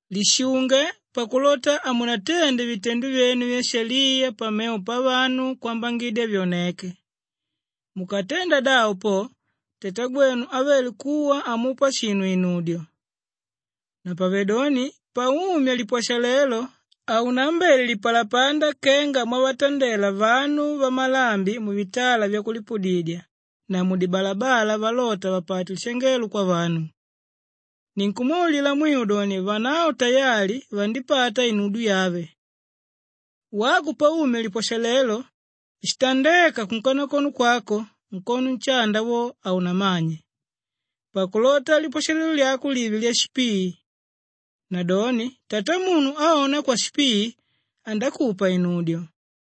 “Lishunge pakulota hamunatende vitendo vyenu vyaishaliya pamevo pavanu kwambangidya vyoneke. Mukatenda davo po, Tatagwenu ávele kuwa hamupa shinu inudyo. Napavedoni paumya lipwashalelo haunaambele lipalapanda kenga mwavatandela vanu vamalambi muvitala vyakulipudidya na mudibalabala valota vapate lishangelo kwavanu. Ninkumwaulila mwiu doni vanavo tayali vandipata inudyo yave. Wako paumya lipwashalelo, shitandéka kunkanakono kwako, nkono nshanda wo haunamanye pakulota lipwashalelo lyako live lyashipii. Nadoni Tatamunu áona kwashipii, andakupa inudyo.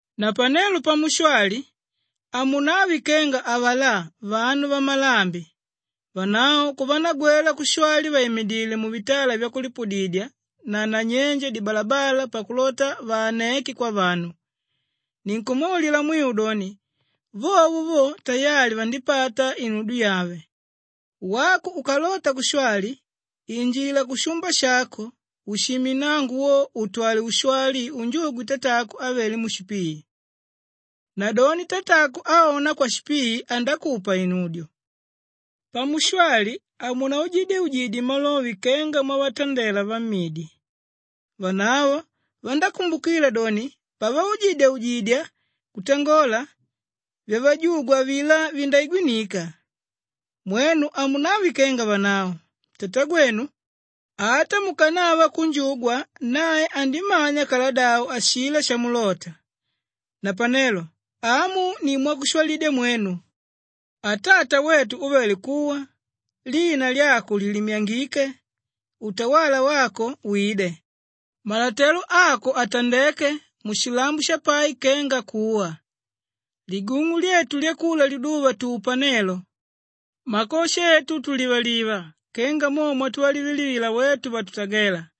“Napanelo pamushwali hamunave kenga avalá vanu vamalambi. Vanavo kuvanagwela kushwali vaimidile muvitala vyakulipudidya na nanyenje dibalabala pakulota vaaneke kwavanu. Ninkumwaulila mwiu doni, vovo vo tayali vandipata inudyo yave. Wako ukalota kushwali injila kushumba shako ushime nnango wo utwale ushwali unjugwe Tatako ávele mushipii. Nadoni Tatako áona kwashipii andakupa inudyo. Pamushwali hamunaujidyeujidye malove kenga mwavatandela vamidi. Vanavo vandákumbukila doni pavaujidyaujidya kutangola, vyavajugwa avilá vindaigwinika. Mwenu hamunave kenga vanavo! Tatagwenu, ata mukanava kunjugwa, nae andimanya kaladavo ashilá shamulóta. Napenelo amu ni mwakushwalidya mwenu, “ ‘Atata wetu úvele kuwa, lina lyako liilimyangike, utawala wako wide, malotelo ako atandeke, mushilambo shapai kenga kuwa. Ligung'u lyetu lyakula liduva, tupa nelo. Makosha etu, tulivaliva kenga mo mwatuvalivalivila wetu vatutagela.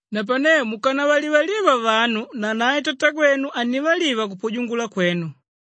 Napane mukanavalivaliva vanu, nanae Tatagwenu hannivaliva kupujungula kwenu.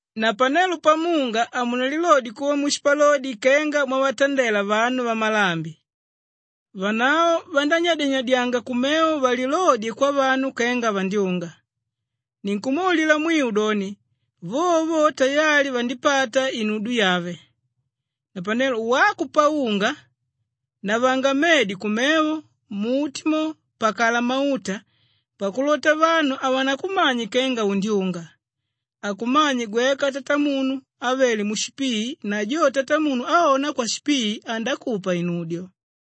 “Napanelo pamunga hamunalilodye kuva mushipalodi kenga mwavatandela vanu vamalambi. Vanavo vandányadyanyadyanga kumevo valilodye kwavanu kenga vandyunga. Ninkumwaulila mwiu doni, vovo vo tayali vandipata inudyo yave. Napane wako paunga, navanga medi kumevo mmuti mo, pakala mauta pakulota vanu havanakumanye kenga undyunga. Akumanye gweka Tatamunu ávele mushipii na jo Tatamunu áona kwashipii, andakupa inudyo.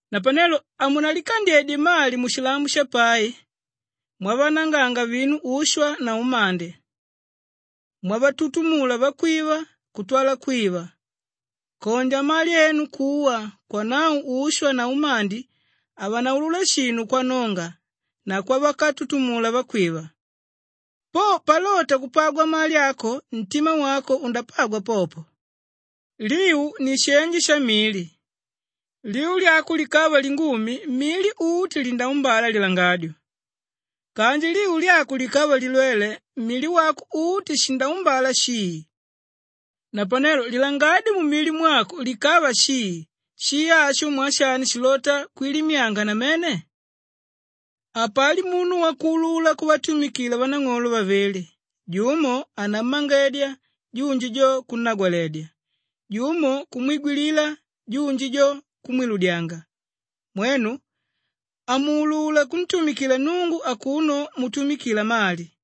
“Napanelo hamunalikandyedye mali mushilambo shapai mwavananganga vinu ushwa na umandi, mwavatutumula vakwiva kutwala kwiva. Kondya mali enu kuwa, kwanavo ushwa na umandi havanaulula shinu kwanonga na kwavakatutumula vakwiva. Po palota kupagwa mali ako ntima wako undapagwa popo. “Liu ni shenje shamili. Liu lyako likava lingumi, mili uti lindaumbala lilangadyo. Kanji liu lyako likava lilwele, mili wako uti shindaumbala shii. Napanelo lilangadyo mumili mwako likava shii, shii asho mwaa shani shilota kwilimyanga namene! “Hapali munu wakuulula kuvatumikila vanang'olo vavili. Jumo anammangedya, junji jo kunnagwaledya; jumo kumwigwilila, junji jo kumwiludyanga. Mwenu hamuulula kuntumikila Nnungu akuno mutumikila mali.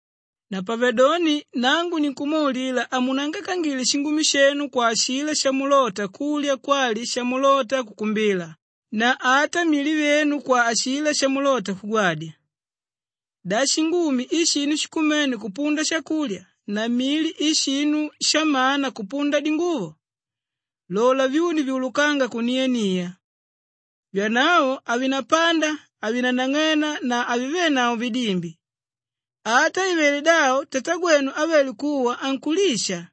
“Napavedoni nangu ninkumwaulila hamunaangaikangile shingumi shenu kwa ashilá shamulota kulya kwali shamulota kukumbila na ata mili vyenu kwa ashilá shakulota kugwadya. Da shingumi i shinu shikumene kupunda shakulya na mili i shinu shamana kupunda dinguvo? Lola vyuni vyulukánga kuniania. Vyanavo havinapanda, havinanang'ena na havivenavo vidimbi. Ata ivele davo Tatagwenu ávele kuwa ankulisha.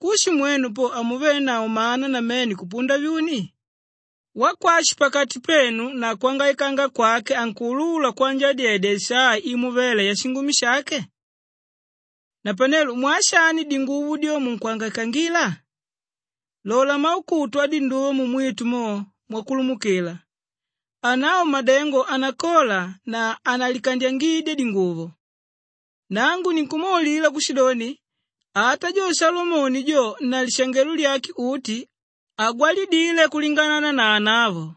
Kushi mwenu po hamuvenavo mana namene kupunda vyuni? Wakwashi pakati penu na kwangaikanga kwake ankuulula kwanjadyedya isaa imo vela yashingumi shake? “Napanelo mwaa shani dinguvo dyo, munkwangaikila? Lola maukutu adinduva mumwitu mo mwakulumukila. Anavo madengo hanakola na hanalikandyangidya dinguvo. Nangu ninkumwaulila kushidoni, ata jo Shalomoni jo na lishangelo lyake uti, hagwalidile kulinganana na anavo.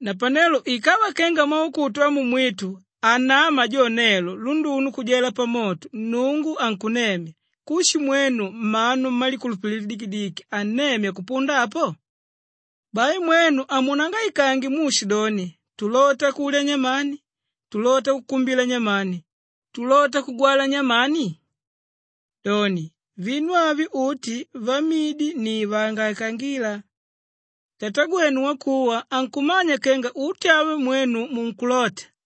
Napane ikava kenga maukutu amumwitu anáma jo nelo lunduno kujela pamoto Nnungu ankunnemya, kushi mwenu mmanu mmalikulupililo lidikidiki hannemya kupunda apo? “Bai mwenu hamunaangaikange muushidoni, ‘Tulota kulya nyamani?’, ‘Tulota kukumbila nyamani?’, ‘Tulota kugwala nyamani?’ Doni, vinu avyo uti vamidi ni vaangaikangíla. Tatagwenu wakuwa ankumanya kenga uti avyo mwenu munkulota.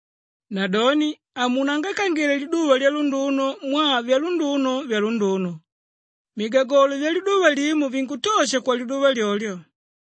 Nadoni hamunangaikangile liduva lyalunduno mwaa vyalunduno, vyalunduno. Migagolo vyaliduva limo vinkutosha kwaliduva lyolyo.